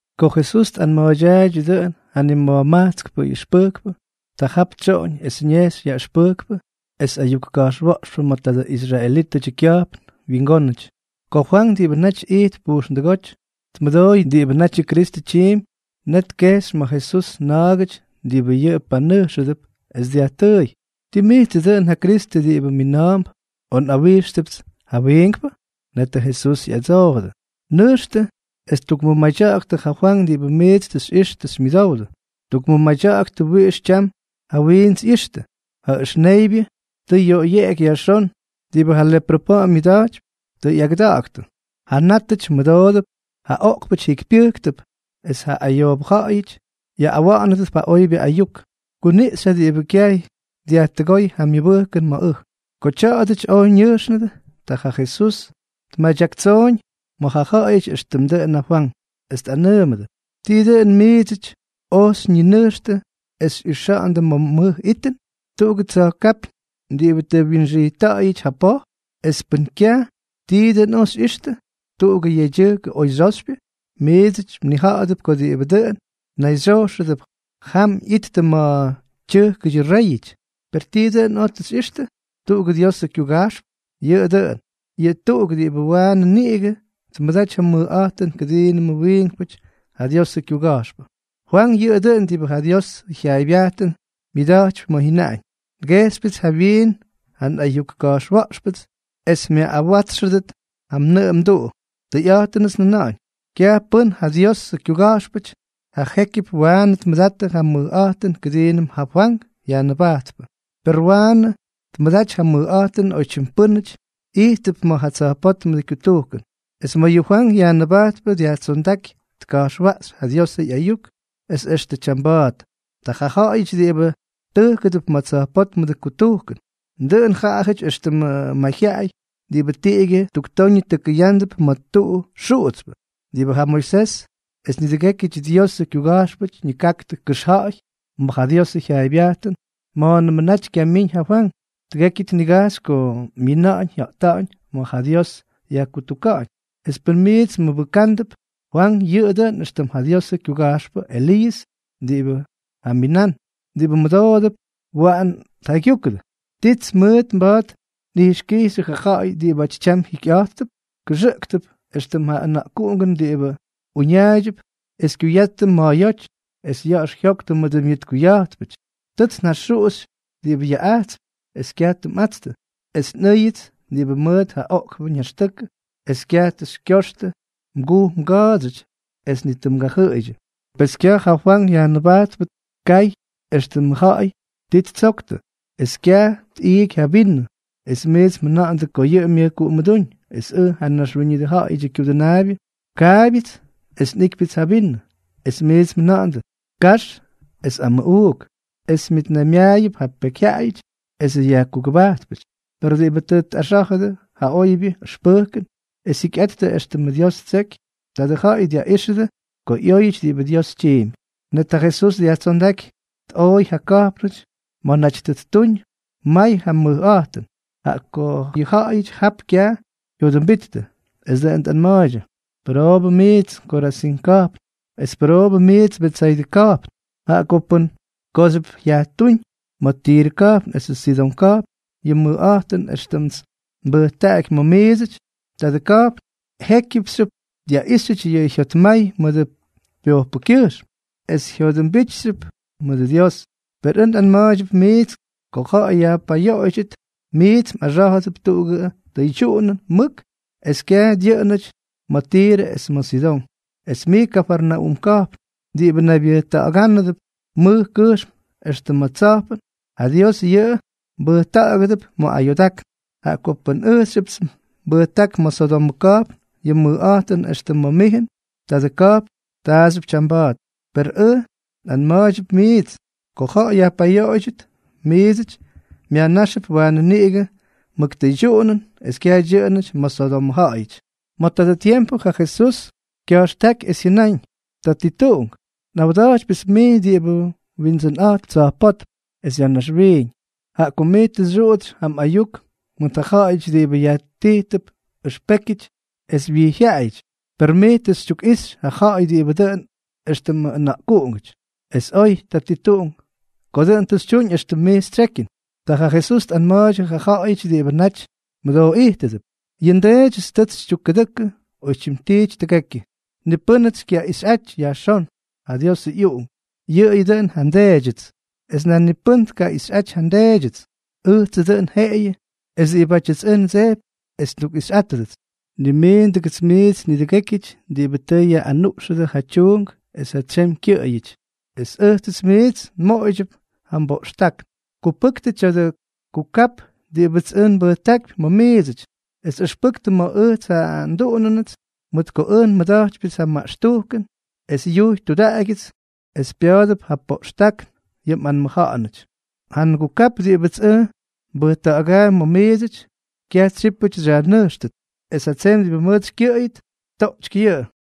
Ko Jesús tꞌanma̱a̱ydyaaydyʉ dʉꞌʉn ja nima̱jmajtskpʉ ꞌyʉxpʉjkpʉ, ta jap tsyoꞌoñ es ñejxy yaꞌʉxpʉjkpʉ es ayuk ka̱jxwa̱ꞌxpʉ ma̱ tadʉ israelítʉdyʉ kya̱jpn wingónʉty. Ko Fwank diꞌibʉ naty ijtp pujxndʉgóty, tmʉdooy diꞌibʉ natyʉ Kristʉ tyiimpy, net tkejxy ma̱ Jesús na̱a̱gʉty diꞌibʉ yʉꞌʉ panʉjxʉdʉp, es dyajtʉʉy: —¿Tii mijtsʉ dʉꞌʉn ja Kristʉ diꞌibʉ mina̱a̱mp, o nꞌawíxtʉpts ja wiinkpʉ? Netʉ Jesús ꞌyadsoojʉdʉ: —Nʉjxtʉ es tukmʉmadya̱ꞌa̱ktʉ ja Fwank diꞌibʉ miits tʉ xyꞌixtʉ tʉ xymyʉdowdʉ. Tukmʉmadya̱ꞌa̱ktʉ wiꞌix tyam ja wiints ꞌyixtʉ, ja ʉxneybyʉ tʉ yoꞌoybyéky yajxón, diꞌibʉ ja leprʉ pa̱ꞌa̱m myʉda̱jtypy tʉ ꞌyagʉda̱ꞌa̱ktʉ, ja nátʉty mʉdoonʉdʉp, ja oꞌkpʉty jikypyʉjktʉp, es ja ayoobʉ ja̱ꞌa̱yʉty yaꞌꞌawa̱ꞌa̱nʉdʉp ja oybyʉ ayuk. Kuniꞌxy ja diꞌibʉ kyaj dyajtʉgóy ja myʉbʉjkʉn ma̱ ʉj. Ko tya̱a̱dʉty oj ñʉjxnʉdʉ, ta ja Jesús tmadyaktsoꞌoñ ma̱ ja ja̱ꞌa̱yʉty éxtʉmʉ dʉꞌʉn ja Fwank, es tꞌanʉʉmʉdʉ: —¿Tii dʉn miidsʉty oj xyñinʉjxtʉ es xyꞌixa̱ꞌa̱ndʉ ma̱ mʉj itʉn? ¿Tuꞌugʉ tsa̱jkápyñ diꞌibʉ tʉ wyinxijtta̱ꞌa̱yʉty ja poj? Es pʉn kyaj, ¿tii dʉn oj xyꞌixtʉ? ¿Tuꞌugʉ yedyʉjk oy xyoxypyʉ? Miits mnija̱ꞌa̱dʉp ko diꞌibʉ dʉn nayxyojxʉdʉp jam ꞌyittʉ ma̱ tyʉjkʉdyʉ réyʉty. ¿Per tii dʉn oj tʉ xyꞌixtʉ? ¿Tuꞌugʉ Diosʉ kyuga̱jxpʉ? Yʉꞌʉ dʉꞌʉn. Yʉꞌʉ tuꞌuk diꞌibʉ waanʉ niꞌigʉ tmʉdaty ja mʉjꞌa̱jtʉn kʉdiinʉmʉ wiinkpʉty ja Diosʉ kyuga̱jxpʉ. Fwank yʉꞌʉ dʉꞌʉn diꞌibʉ ja Diosʉ jyaaybyajtʉn myadyakypy ma̱ jyʉnaꞌañ: Ngejxypyʉts jawyiin ja nꞌayuk ka̱jxwa̱ꞌxpʉts es myaꞌꞌawátsxʉdʉt yʉ mnʉꞌʉ mduꞌu. Tʉyꞌa̱jtʉnʉts njʉna̱ꞌa̱ñ: Kyaj pʉ́n ja Diosʉ kyuga̱jxpʉty ja jékyʉp waanʉ tmʉdattʉ ja mʉjꞌa̱jtʉn kʉdiinʉm ja Fwank Yajnʉbajtpʉ; per waanʉ tmʉdaty ja mʉjꞌa̱jtʉn oytyim pʉ́nʉty ijttʉp ma̱ ja tsa̱jpótmʉdʉ kutujkʉn. ’Es ma̱ yʉ Fwank Yajnʉbajtpʉ dyajtsondáky tka̱jxwaꞌxy ja Diosʉ ꞌyayuk es extʉ tyamba̱a̱t, ta ja ja̱ꞌa̱yʉty diꞌibʉ tʉjkʉdʉp ma̱ tsa̱jpótmʉdʉ kutujkʉn. Dʉꞌʉn jaꞌajʉty éxtʉmʉ mayjyaꞌay diꞌibʉ tiꞌigyʉ tuktoñʉ tʉkʉyándʉp ma̱ tuꞌu xuꞌutspʉ. Diꞌibʉ ja Moisés es nidʉgékyʉdyʉ Diosʉ kyuga̱jxpʉty ñikaktʉ kʉxja̱ꞌa̱y ma̱ ja Diosʉ jyaaybyajtʉn ma̱a̱nʉmʉ naty kyamíñ ja Fwank, tʉgekyʉ tnigajxy ko myina̱ꞌa̱ñ jya̱ꞌta̱ꞌa̱ñ ma̱ ja Dios yajkutuka̱ꞌa̱ñ. Es pʉn miits mmʉbʉkándʉp, Fwank yʉꞌʉ dʉꞌʉn éxtʉm ja Diosʉ kyuga̱jxpʉ Eliiʉs diꞌibʉ jaminán. Diꞌibʉ mʉdoodʉp, waꞌan tjaygyúkʉdʉ. ’¿Tits mʉʉt mba̱a̱t nꞌijxkijxyʉ ja ja̱ꞌa̱y diꞌibáty tyam jikyꞌa̱jttʉp? Kʉxʉꞌktʉp éxtʉm ja ʉna̱ꞌkuꞌungʉn diꞌibʉ uñaaydyʉp es kyuyattʉ ma̱a̱yóty, es ya̱ꞌa̱x jyoktʉ mʉdʉ myʉtkuya̱jtpʉty: “Tʉts njaxuꞌuxy diꞌibʉ yaꞌꞌajtsp, es kyaj tʉ mꞌatstʉ; es tʉ nꞌʉ́yʉts diꞌibʉ mʉʉt ja oꞌkpʉ ñaxtʉkʉ, es kyaj tʉ xykyoxtʉ mguj mga̱a̱dsyʉty es ni tʉ mgajʉꞌʉydyʉ.” ’Pes kyaj ja Fwank Yajnʉbajtpʉ tkay éxtʉmʉ ja̱ꞌa̱y ti ttsoktʉ, es kyaj tꞌiiky ja vinʉ, es miits mjʉna̱ꞌa̱ndʉ ko yʉꞌʉ myʉjkuꞌumʉdúñ. Es ʉj, ja Naxwíñʉdʉ Ja̱ꞌa̱yʉdyʉ Kyudʉnaabyʉ, kaabyʉts es nꞌiꞌkypyʉts ja vinʉ, es miits mjʉna̱ꞌa̱ndʉ: “Kax es amʉꞌuuk, es myʉtnaymyaayʉp ja pekyjyaꞌayʉty esʉ yajkugʉbajtpʉty.” Per diꞌibʉ tʉ tꞌaxá̱jʉdʉ yʉ oybyʉ ʉxpʉjkʉn es jyikyꞌattʉ éxtʉmʉ Dios ttseky, tadʉ ja̱ꞌa̱y dyaꞌíxʉdʉ ko ꞌyóyʉty diꞌibʉ Dios tyiimpy. Net ja Jesús dyajtsondáky tꞌooy ja ka̱jpnʉty ma̱ naty tʉ ttuñ may ja mʉjꞌa̱jtʉn, jaꞌa ko yʉ ja̱ꞌa̱yʉty jap kyaj jyodʉmbittʉ. Es dʉꞌʉn tꞌanma̱a̱ydyʉ: —¡Pʉroobʉ mijts Korazín ka̱jpn, es pʉroobʉ mijts Betsaydʉ ka̱jpn! Jaꞌa ko pʉn kooxyʉp yajtuuñ ma̱ Tirʉ ka̱jpn esʉ Sidón ka̱jpn yʉ mʉjꞌa̱jtʉn éxtʉmts nbʉjtaꞌaky ma̱ miidsʉty, tadʉ ka̱jpn jékyʉpxyʉp dyaꞌíxyʉty yʉ jyotmay mʉdʉ pyojpʉkyʉjxm, es jyodʉmbijtxyʉp mʉdʉ Dios. Per ʉj nꞌanma̱a̱ydyʉp miits ko ja̱ꞌa̱y yajpayoꞌoydyʉt, miits mꞌaxá̱jʉdʉp tuꞌugʉ tʉydyuꞌunʉn mʉk es kyaj dyʉꞌʉnʉty ma̱ Tirʉ es ma̱ Sidón. Es mij Kafarnaúm ka̱jpn, diꞌibʉ naybyʉjta̱ꞌa̱gánʉp mʉj kʉjxm extʉ ma̱ tsa̱jpʉn, ¡ja Dios yʉꞌʉ mbʉjta̱ꞌa̱gʉdʉp ma̱ ayoodákn! Jaꞌa ko pʉn ʉjxyʉpts nbʉjták ma̱ Sodomʉ ka̱jpn yʉ mʉjꞌa̱jtʉn éxtʉm ma̱ mijʉn, tadʉ ka̱jpn taaxyʉp tyamba̱a̱t. Per ʉj nꞌanma̱a̱ydyʉp miits, ko ja̱ꞌa̱y yajpayoꞌoydyʉt, miidsʉty myajnáxʉp waanʉ niꞌigʉ mʉk ja tʉydyuꞌunʉn es kyaj dyʉꞌʉnʉty ma̱ Sodomʉ ja̱ꞌa̱yʉty. Ma̱ tadʉ tiempʉ ja Jesús kya̱jxtáky, es jyʉnáñ: —Tatituꞌunk, nꞌawda̱jtypyʉts mij diꞌibʉ Windsʉnꞌa̱jtp tsa̱jpótm es ya̱ naxwiiñ, jaꞌa ko mij tʉ xyuꞌutsy ja mꞌayuk mʉt ja ja̱ꞌa̱yʉty diꞌibʉ yajtijtʉp ʉxpékyʉty es wijyjyaꞌayʉty, per mij tʉ xytyukꞌixy ja ja̱ꞌa̱y diꞌibʉ dʉꞌʉn éxtʉm ʉna̱ꞌkuꞌungʉty. Es oy, Tatituꞌunk, ko dʉꞌʉn tʉ xytyuñ éxtʉm mij xytsyekyʉn. Ta ja Jesús tꞌanma̱a̱ydyʉ ja ja̱ꞌa̱yʉty diꞌibʉ naty mʉdooꞌijtʉdʉp: —Yʉ nDeedyʉts tʉts xytyukkʉdʉkʉ oytyim tiity tʉgekyʉ. Ni pʉ́nʉts xykyaꞌixyꞌaty yajxón, ja Diosʉ ꞌyUꞌunk, yʉꞌʉyʉ dʉꞌʉn ja nDeedyʉts; es nan ni pʉ́nʉmts tkaꞌixyꞌaty ja nDeedyʉts, ʉjtsʉ dʉn jeꞌeyʉ es diꞌibátyʉts ʉj ndsejpy es ndukꞌixyꞌátʉdʉts. Nimiindʉgʉts miits nidʉgékyʉty diꞌibʉ tʉ yaꞌꞌanuꞌxʉdʉ ja tyuunk es ja tsyemy kyʉꞌʉyʉty, es ʉjtsʉts miits nmoꞌoydyʉp ja mboꞌxtákn. Kupʉktʉ tya̱dʉ kukap diꞌibʉts ʉj nbʉjtákypy ma̱ miidsʉty, es ʉxpʉktʉ ma̱ ʉjts ja nduꞌunʉnʉts, mʉt ko ʉj nmʉda̱jtypyʉts ja maꞌxtujkʉn es yujy tudaꞌagyʉts, es pya̱a̱dʉp ja poꞌxtákn yʉ mꞌanmʉja̱ꞌa̱nʉty. Ja ngukap diꞌibʉts ʉj nbʉjta̱ꞌa̱gaampy ma̱ miidsʉty, kyaj tsyípʉty xyajnʉjxtʉt, es ja tsemy diꞌibʉ mʉʉt xykyʉꞌʉyʉt, toꞌtsyky yʉꞌʉ.